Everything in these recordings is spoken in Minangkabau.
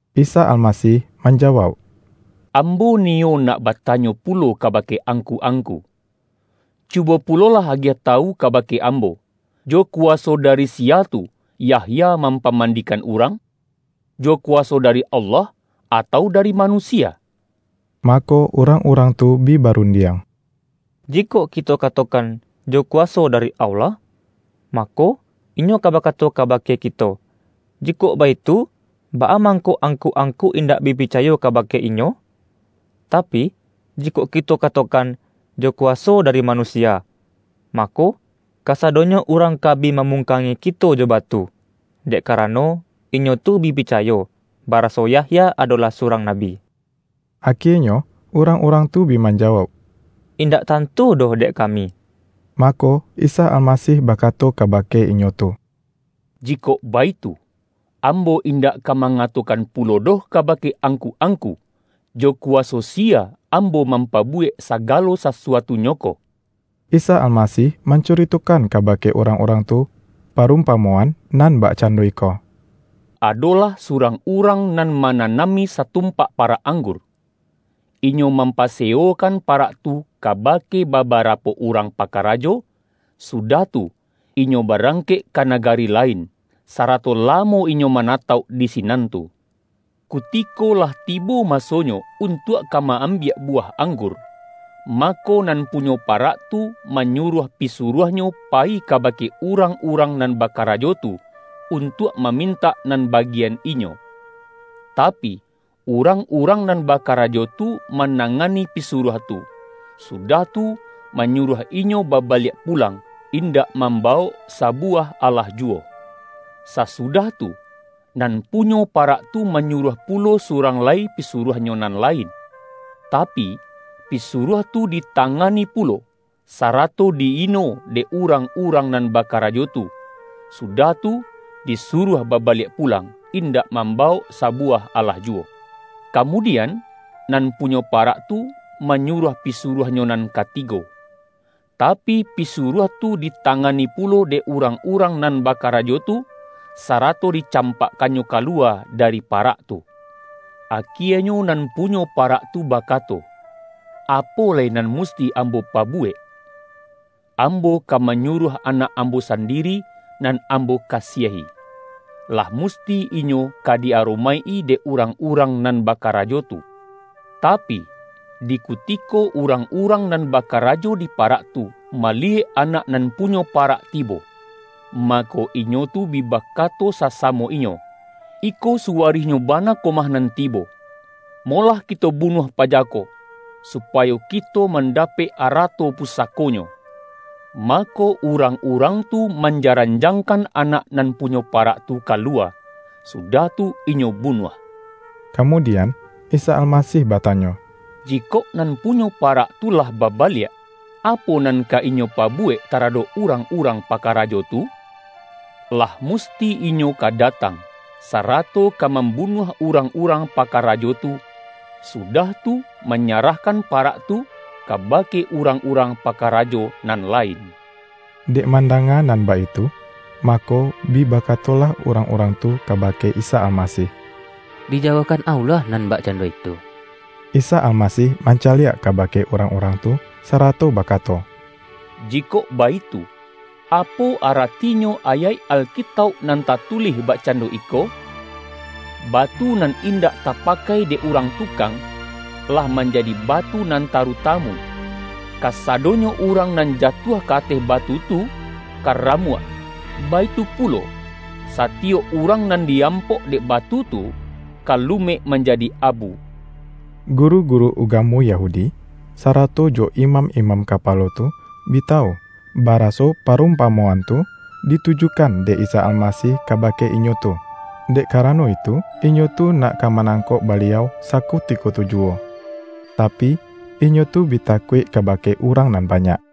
Isa Almasih manjawauk,”Ambo iyo nak batanyo pulo kabake angku-ang-ku. Cubo pulolah agiah tawu kabake Ambo, jo kuwaso dari siya tu, Yahya mampamandikan urang? Jo kuwaso dari Allah, atau dari manusia?” Mako, urang-urang tu bi barun-diang,”Jikok kito katokan, ’Jo kuwa-so dari Allah,' mako, Inyo ka bakato kabake kito, ’Jikok baitu, baa mangko angku-angku indak bi picayo kabake inyo?' Tapi, jikok kito katokan, ’Jo ku-waso dari manusia,' mako, kasadonyo urang ka bi mamungkangi kito jo batu, dek karano, inyo tu bi picayo, baraso Yahya adolah surang nabi.” Akienyo urang-urang tu bi manjawauk,”Indak tantu doh dek kami.” Mako, Isa Almasih bakato kabake inyo tu,”Jikok baitu, Ambo indak ka mangatokan pulo doh kabake angku-angku, jo kuwaso siya Ambo mampa-buwek sagalo sasuatunyo ko.” Isa Almasih mancuritokan kabake urang-urang tu, parumpamoan nan bakcando iko,”Adolah surang urang nan mananami satumpak parak ang-gur. Inyo mampasewokan parak tu kabake babarapo urang pakarajo, su-dah tu, inyo barangkek ka nagari lain, sarato lamo inyo manatauk di sinan tu. Kutiko lah tibo masonyo untuak ka ma-ambiak buwah anggur, mako, nan punyo parak tu, manyuruah pi-suruahnyo payi kabake urang-urang nan bakarajo tu, untuak mamintak nan bagian inyo. Tapi, urang-urang nan bakarajo tu manangani pisuruah tu, sudah tu, manyuruah inyo baba-liak pulang, indak mambawok sabu-wah alah juwo. Sasudah tu, nan pu-nyo parak tu manyuruah pulo surang lai pisuruahnyo nan lain; tapi, pisu-ruah tu ditangani pulo, sarato di-ino dek urang-urang nan bakarajo tu, su-dah tu, disuruah babaliak pulang, in-dak mambawok sabuwah alah juwo. Kamudian, nan punyo parak tu, manyuruah pisuruahnyo nan katigo. Tapi, pisuruah tu ditangani pulo dek urang-urang nan bakarajo tu, sara-to dicampakkannyo ka luwa dari pa-rak tu. Akienyo nan punyo parak tu bakato, ’Apo lai nan musti ambo pabuwek? Ambo ka manyuruah anak ambo sandiri, nan ambo kasiahi. Lah musti inyo ka di-aromaik-i dek urang-urang nan bakarajo tu!' Tapi, di ku-tiko urang-urang nan bakarajo di pa-rak tu, maliyek anak nan punyo parak tibo, mako, inyo tu bi bakato sasamo inyo, ’Iko suwarihnyo bana ko mah nan tibo. Molah kito bunuah paja ko, supayo kito mandapek arato pusako-nyo.’ Mako, urang-urang tu manja-ranjangkan anak nan punyo parak tu ka luwa, sudah tu inyo bunuah.” Kamudian, Isa Almasih batanyo,”Jikok nan punyo parak tu lah baba-liak, apo nan ka inyo pabuwek tara-dok urang-urang pakarajo tu? Lah musti inyo ka datang, sarato ka mam-bunuah urang-urang pakarajo tu, su-dah tu manyarahkan parak tu kabake urang-urang pakarajo nan lain.” Dek mandanga nan baitu, mako, bi bakatolah urang-urang tu kabake Isa Almasih,”Dijauahkan Allah nan bak-cando itu!” Isa Almasih mancaliak kabake urang-urang tu, sarato bakato,”Jikok baitu, apo aratinyo ayaik Alkitauk nan tatulih bakcando iko? ’Batu nan indak tapakai dek urang tukang, lah manjadi batu nan tarutamu.’ Kasadonyo urang nan jatuah ka ateh batu tu, ka ramuak; baitu pulo, satiyok urang nan di-ampok dek batu tu, ka lumek manjadi abu.” Guru-guru ugamo Yahudi, sarato jo imam-imam kapalo tu bi tawu, ba-raso parumpamoan tu ditujukan dek Isa Almasih kabake inyo tu. Dek ka-rano itu, inyo tu nak ka manangkok Baliau sakutiko tu juwo, tapi, inyo tu bi takuik kabake urang nan banyak.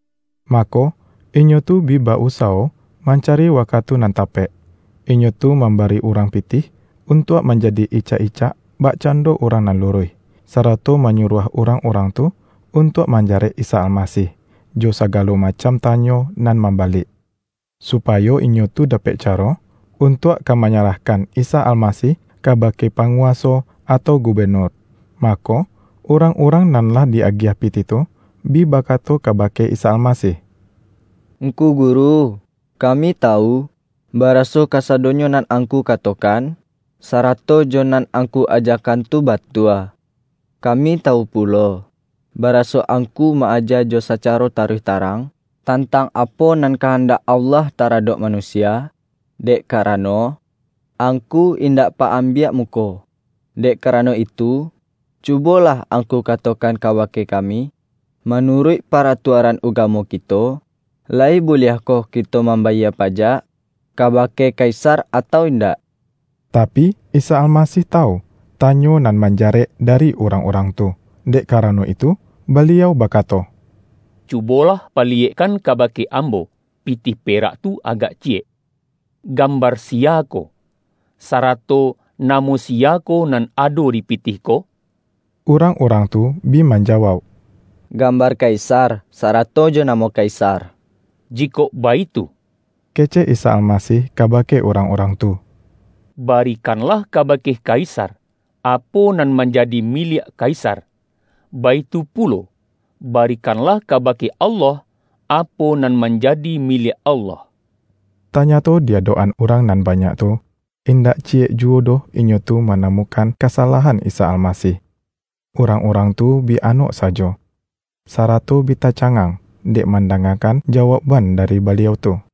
Mako, inyo tu bi ba-usawo mancari wakatu nan tapek. Inyo tu mambari urang pitih, untuak manjadi icak-icak bakcando urang nan luruih, sarato ma-nyuruah urang-urang tu untuak man-jarek Isa Almasih, jo sagalo macam tanyo nan mambalik, supayo inyo tu dapek caro, untuak ka manyarahkan Isa Almasih kabake panguwaso, atau gubenur. Mako, urang-urang nan lah di-agiah pitih tu, bi bakato kabake Isa Almasih,”Ngku Guru, kami tawu, ba-raso kasadonyo nan Angku katokan, sarato jo nan Angku ajakan tu batua. Kami tawu pulo, baraso Angku ma-aja jo sacaro taruih tarang, tantang apo nan kahandak Allah taradok manu-sia, dek karano, Angku indak pa-am-biak muko. Dek karano itu, cubolah Angku katokan kabake kami, manu-ruik paratuaran ugamo kito, layi bu-liahkoh kito mambayie pajak kabake Kaisar, atau indak?” Tapi, Isa Almasih tawu, tanyo nan manjarek dari urang-urang tu. Dek ka-rano itu, Baliau bakato, ”Cubolah paliyekkan kabake Ambo, pitih perak tu agak ciyek. Gambar siya ko, sarato namo siya ko, nan ado di pitih ko?” Urang-urang tu bi manjawauk,”Gam-bar Kaisar, sarato jo namo Kaisar!” ”Jikok baitu,” kecek Isa Almasih kabake urang-urang tu,”Barikanlah kabake Kaisar, apo nan manjadi mi-liak Kaisar, baitu pulo, barikanlah ka-bake Allah, apo nan manjadi miliak Allah.” Tanyato di adok-an urang nan ba-nyak tu, indak ciyek juwo doh inyo tu manamukan kasalahan Isa Almasih. Urang-urang tu bi anok sajo, sarato bi tacangang, dek mandangakan ja-waukban dari Baliau tu.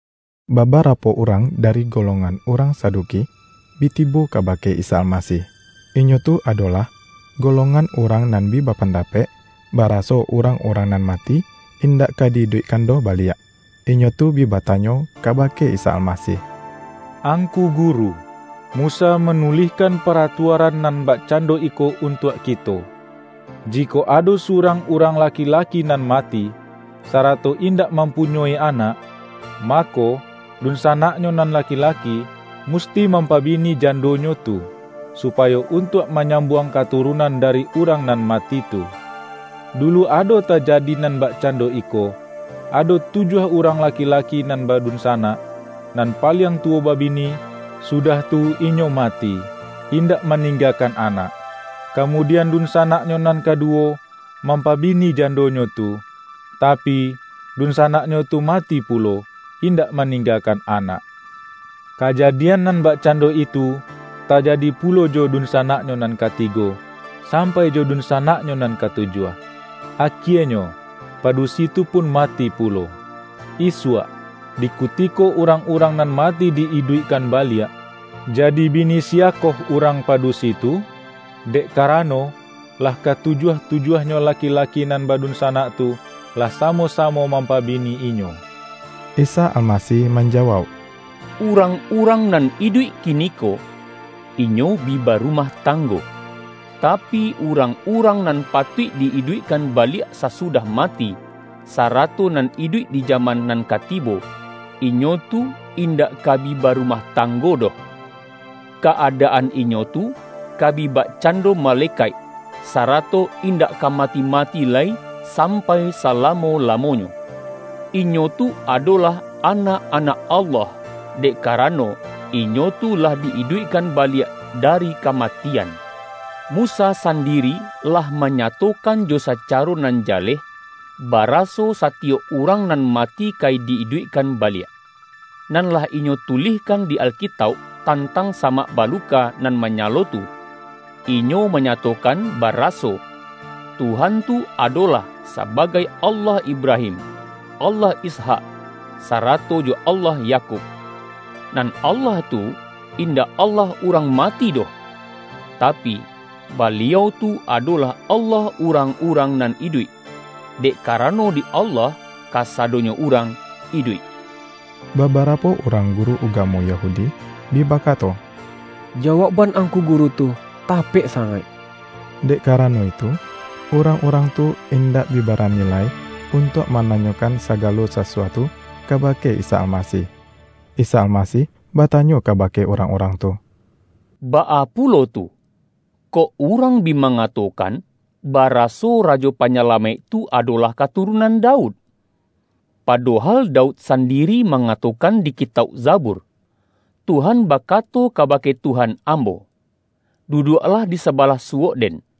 Babarapo urang dari golongan urang Saduki, bi tibo kabake Isa Al-masih. ( Inyo tu adolah golongan urang nan bi bapandapek, baraso urang-urang nan mati, indak ka di-iduikkan doh baliak.) Inyo tu bi batanyo kaba-ke Isa Almasih, ”Angku Guru, Musa manulihkan paratuaran nan bakcan-do iko untuak kito: Jikok ado surang urang laki-laki nan mati, sarato indak mampunyoi anak, mako, dunsanak-nyo nan laki-laki, musti mampabini jandonyo tu, supayo untuak manyam-buang katurunan dari urang nan ma-ti tu. Dulu ado tajadi nan bakcando iko, ado tujuah urang laki-laki nan ba-dunsanak. Nan paliang tuwo babini, sudah tu inyo mati, indak maningga-kan anak. Kamudian, dunsanaknyo nan kaduwo, mampabini jandonyo tu, tapi, dunsanaknyo tu mati pulo, in-dak maninggakan anak. Kajadian nan bakcando itu, tajadi pulo jo dun-sanaknyo nan katigo, sampai jo dun-sanaknyo nan katujuah. Akienyo, padusi tu pun mati pulo. Isuak, di kutiko urang-urang nan mati di-iduik-kan baliak, jadi bini siyakoh urang pa-dusi tu? Dek karano, lah katujuah-tu-juahnyo laki-laki nan badunsanak tu, lah samo-samo mampabini inyo.” Isa Almasih manjawauk,”Urang-urang nan iduik kiniko, inyo bi baru-mah tanggo, tapi, urang-urang nan patuik di-iduikkan baliak sasudah ma-ti, sarato nan iduik di jaman nan ka tibo, inyo tu indak ka bi barumah tanggo doh. Ka-adaan inyo tu ka bi bakcando ma-lekaik, sarato indak ka mati-mati lai sampai salamo-lamonyo. Inyo tu adolah anak-anak Allah, dek karano inyo tu lah di-iduikkan baliak dari kamatian. Mu-sa sandiri lah manyatokan jo sacaro nan jaleh, baraso satiyok urang nan mati ka di-iduikkan baliak. Nan lah inyo tulih-kan di Alkitauk, tantang samak baluka nan manyalo tu, inyo mangatokan bara-so, Tuhan tu adolah sabagai ’Allah Ibra-him, Allah Ishak sarato jo Allah Yakub'. Nan Allah tu, indak Allah urang mati doh! Tapi, Baliau tu adolah Allah urang-urang nan iduik! Dek karano di Allah, ka-sadonyo urang iduik.” Babarapo urang guru ugamo Ya-hudi, bi bakato,”Jawaukban Angku Guru tu, tapek sangaik.” Dek kara-no itu, urang-urang tu indak bi bara-ni lai untuak mananyokan sagalo sa-suatu kabake Isa Almasih. Isa Almasih batanyo kabake urang-urang tu,”Baa pulo tu, kok urang bi mangatokan, baraso Rajo Panyalamaik tu adolah katurunan Daud? Pado-hal Daud sandiri mangatokan di ki-tauk Zabur, ’Tuhan bakato kabake Tuhan ambo: Duduaklah di sabalah suwok-Den,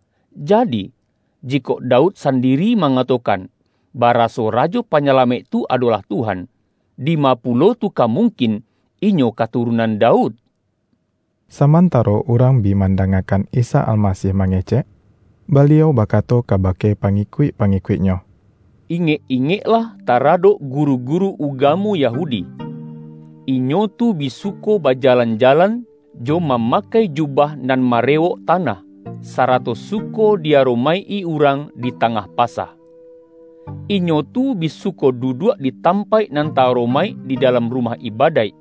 Jadi, jikok Daud sandiri manga-tokan, baraso Rajo Panyalamaik tu adolah ’Tuhan’, dima pulo tu ka mung-kin Inyo katurunan Daud?” Samantaro urang bi mandangakan Isa Almasih mangecek, Baliau baka-to kabake pangikuik-pangikuik-Nyo, ”Ingek-ingeklah taradok guru-guru ugamo Yahudi. Inyo tu bi suko baja-lan-jalan, jo mamakai jubah nan ma-rewok tanah, sarato suko di-aromaik-i urang di tangah pasa. Inyo tu bi su-ko duduak di tampaik nan ta-aromaik di dalam rumah ibadaik,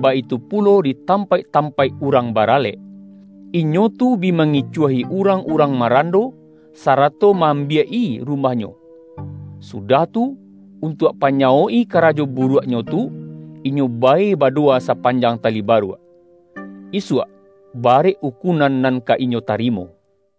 baitu pulo di tampaik-tampaik urang baralek. Inyo tu bi mangicuahi urang-urang marando, sarato ma-ambiak-i rumah-nyo. Sudah tu, untuak panyawok-i ka-rajo buruaknyo tu, inyo bae badowa sapanjang tali baruak! Isuak, barek ukunan nan ka inyo tarimo!”